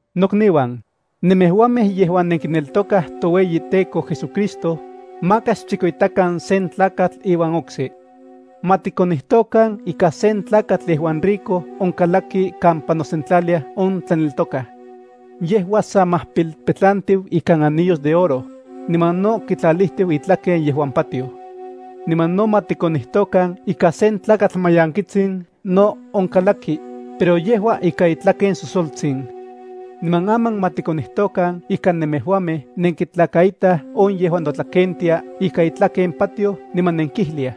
Nokniuan, nemejuamej yejuan nenkineltokaj toueyiTEKO JesuCristo, maka xchikoitakan sen tlakatl iuan okse. Ma tikonijtokan ika sen tlakatl yejuan rico onkalaki kampa nosentlaliaj on tlaneltokaj. Yejua sa majpilpetlantiu ikan anillos de oro, niman no kitlalijtiu itlaken yejuan patioj. Niman no ma tikonijtokan ika sen tlakatl mayankitsin no onkalaki, pero yejua ikan itlaken sosoltsin. Niman aman ma tikonijtokan ika nemejuamej nenkitlakaitaj on yejuan notlakentia ikan itlaken patioj niman nenkijliaj: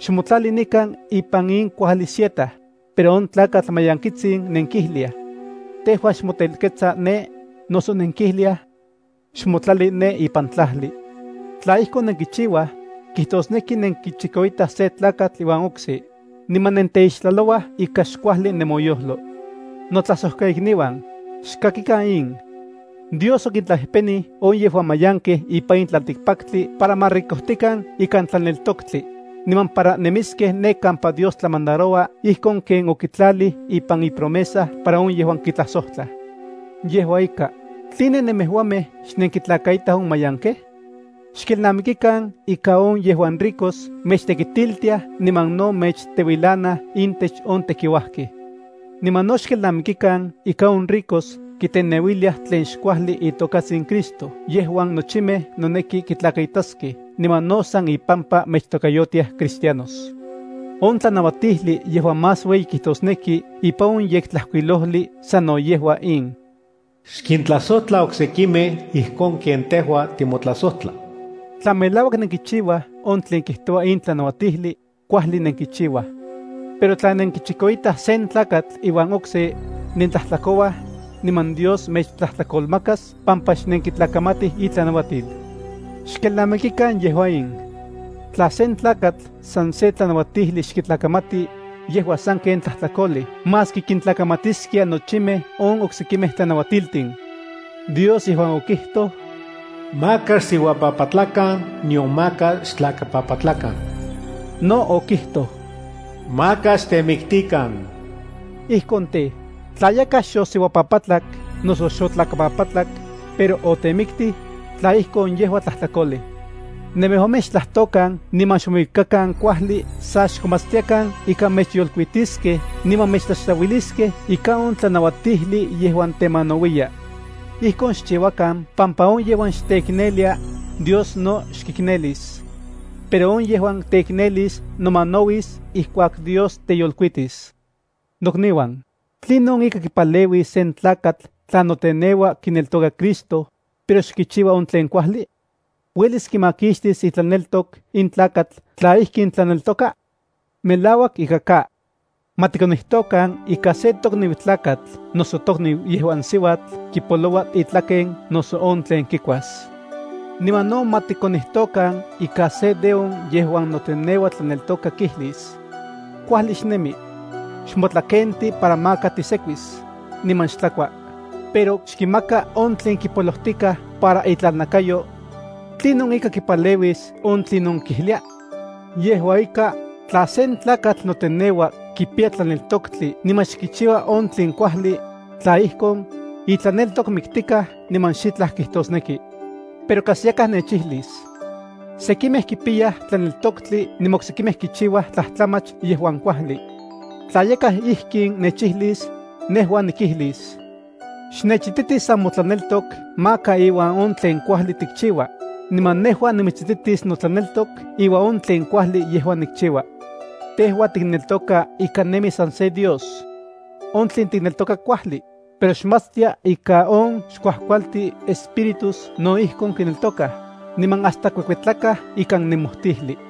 “Xmotlali nikan ipan in kuajli sieta”, pero on tlakatl mayankitsin nenkijliaj: “Tejua xmotelketsa ne”, noso nenkijliaj: “Xmotlali ne ipan tlajli.” Tla ijkon nenkichiuaj, kitosneki nenkichikoitaj sen tlakatl iuan okse, niman nenteixtlalouaj ikan xkuajli nemoyojlo. Notlajsojkaikniuan, xkakikan in: Dios okintlapejpenij on yejuan mayankej ipan in tlaltikpaktli para ma ricojtikan ikan tlaneltoktli, niman para nemiskej ne kampa Dios tlamandaroua ijkon ken okitlalij ipan ipromesa para on yejuan kitlajsojtlaj. Yejua ika, ¿tline nemejuamej xnenkintlakaitaj on mayankej? Xkelnamikikan ika on yejuan ricos mechtekitiltiaj niman no mechteuilanaj intech on tekiuajkej. Niman no xkelnamikikan ika on ricos kiteneuiliaj tlen xkuajli itokatsin Cristo yejuan nochimej noneki kitlakaitaskej niman no san ipampa mechtokayotiaj Cristianos. On tlanauatijli yejuan más ueyi kijtosneki ipan on Yektlajkuilojli sano yejua in: “Xkintlajsojtla oksekimej ijkon ken tejua timotlajsojtla.” Tla melauak nenkichiuaj on tlen kijtoua in tlanauatijli, kuajli nenkichiuaj. Pero tla nenkichikoitaj sen tlakatl iuan okse, nentlajtlakouaj, niman Dios mechtlajtlakolmakas pampa xnenkitlakamatij itlanauatil. Xkelnamikikan yejua in: Tla sen tlakatl san se tlanauatijli xkitlakamati, yejua sanken tlajtlakolej maski kintlakamatiskia nochimej on oksekimej tlanauatiltin. Dios yejuan okijtoj: “Maka xsiuapapatlakan nion maka xtlakapapatlakan”, no okijtoj: “Maka xtemiktikan.” Ijkon tej, tla yakaj xosiuapapatlak noso xotlakapapatlak, pero otemiktij, tla ijkon yejua tlajtlakolej. Nemejuamej xtlajtokan niman xmouikakan kuajli, sa xkomatstiakan ika mechyolkuitiskej niman mechtlaxtlauiliskej ika on tlanauatijli yejuan temanauiya. Ijkon xchiuakan pampa on yejuan xteiknelia, Dios no xkiknelis. Pero on yejuan teiknelis nomanauis ijkuak Dios teyolkuitis. Nokniuan, ¿tlinon ika kipaleuis sen tlakatl tla noteneua kineltoka Cristo, pero xkichiua on tlen kuajli? ¿Uelis kimakixtis itlaneltok in tlakatl tla ijkin tlaneltoka? ¡Melauak ika ka! Ma tikonijtokan ika sen tokniu tlakatl noso tokniu yejuan siuatl kipoloua itlaken noso on tlen kikuas. Niman no ma tikonijtokan ika se de on yejuan noteneua tlaneltoka kijlis: “Kuajli xnemi. Xmotlakenti para maka tisekuis, niman xtlakua”, pero xkimaka on tlen kipolojtikaj para itlalnakayo. ¿Tlinon ika kipaleuis on tlinon kijlia? Yejua ika, tla sen tlakatl noteneua kipiya tlaneltoktli niman xkichiua on tlen kuajli, tla ijkon, itlaneltok miktikaj niman xitlaj kijtosneki. Pero kas yakaj nechijlis: “Sekimej kipiyaj tlaneltoktli niman oksekimej kichiuaj tlajtlamach yejuan kuajli.” Tla yakaj ijkin nechijlis, nejua nikijlis: “Xnechititi san motlaneltok maka iuan on tlen kuajli tikchiua, niman nejua nimitsititis notlaneltok iuan on tlen kuajli yejuan nikchiua. Tejua tikneltoka ika nemi san se Dios. On tlen tikneltoka kuajli, pero xmatstia ika on xkuajkualtin espíritus no ijkon kineltokaj, niman hasta kuekuetlakaj ikan nemojtijli.”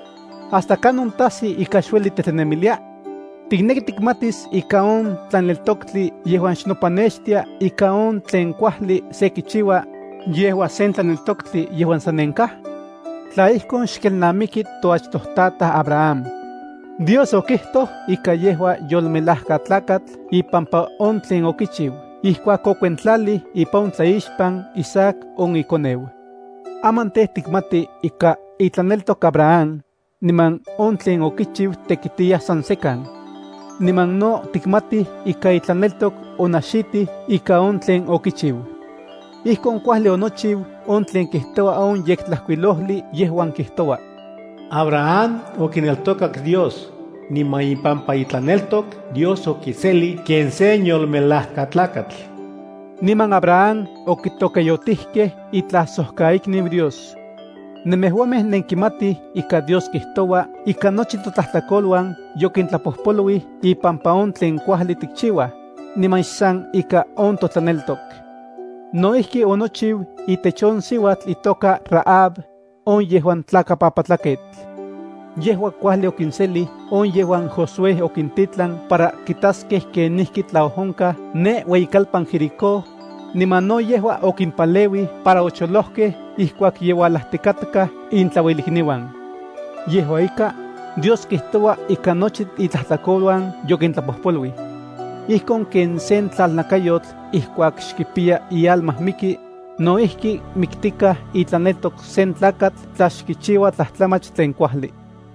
¿Hasta kanon tajsi ika xueli titlanemilia? ¿Tikneki tikmatis ika on tlaneltoktli yejuan xnopanextia ika on tlen kuajli se kichiua, yejua sen tlaneltoktli yejuan sanenkaj? Tla ijkon, xkelnamiki toachtojtataj Abraham. Dios okijtoj ika yejua yolmelajkatlakatl ipampa on tlen okichiu ijkuak okuentlalij ipan on tlaixpan Isaac on ikoneu. Aman tej, tikmati ika itlaneltok Abraham, niman on tlen okichiu tekitiyaj san sekan. Niman no tikmati ika itlaneltok onaxitij ika on tlen okichiu. Ijkon kuajli onochiu on tlen kijtoua on Yektlajkuilojli yejuan kijtoua: “Abraham okineltokak Dios, niman ipampa itlaneltok Dios okiselij ken sen yolmelajkatlakatl.” Niman Abraham okitokayotijkej itlajsojkaikniu Dios. Nemejuamej nenkimatij ika Dios kijtoua ika nochi totlajtlakoluan yokintlapojpoluij ipampa on tlen kuajli tikchiuaj, niman xsan ika on totlaneltok. No ijki onochiu itech on siuatl itoka Rahab, on yejuan tlakapapatlaketl. Yejua kuajli okinselij on yejuan Josué okintitlan para kitaskej kenijki tlaojonkaj ne ueyikalpan Jericó, niman no yejua okimpaleuij para ocholojkej ijkuak ye ualajtikatkaj intlauelikniuan. Yejua ika, Dios kijtoua ika nochi itlajtlakoluan yokintlapojpoluij. Ijkon ken sen tlalnakayotl ijkuak xkipiya ialma miki, no ijki miktikaj itlaneltok sen tlakatl tla xkichiua tlajtlamach tlen kuajli.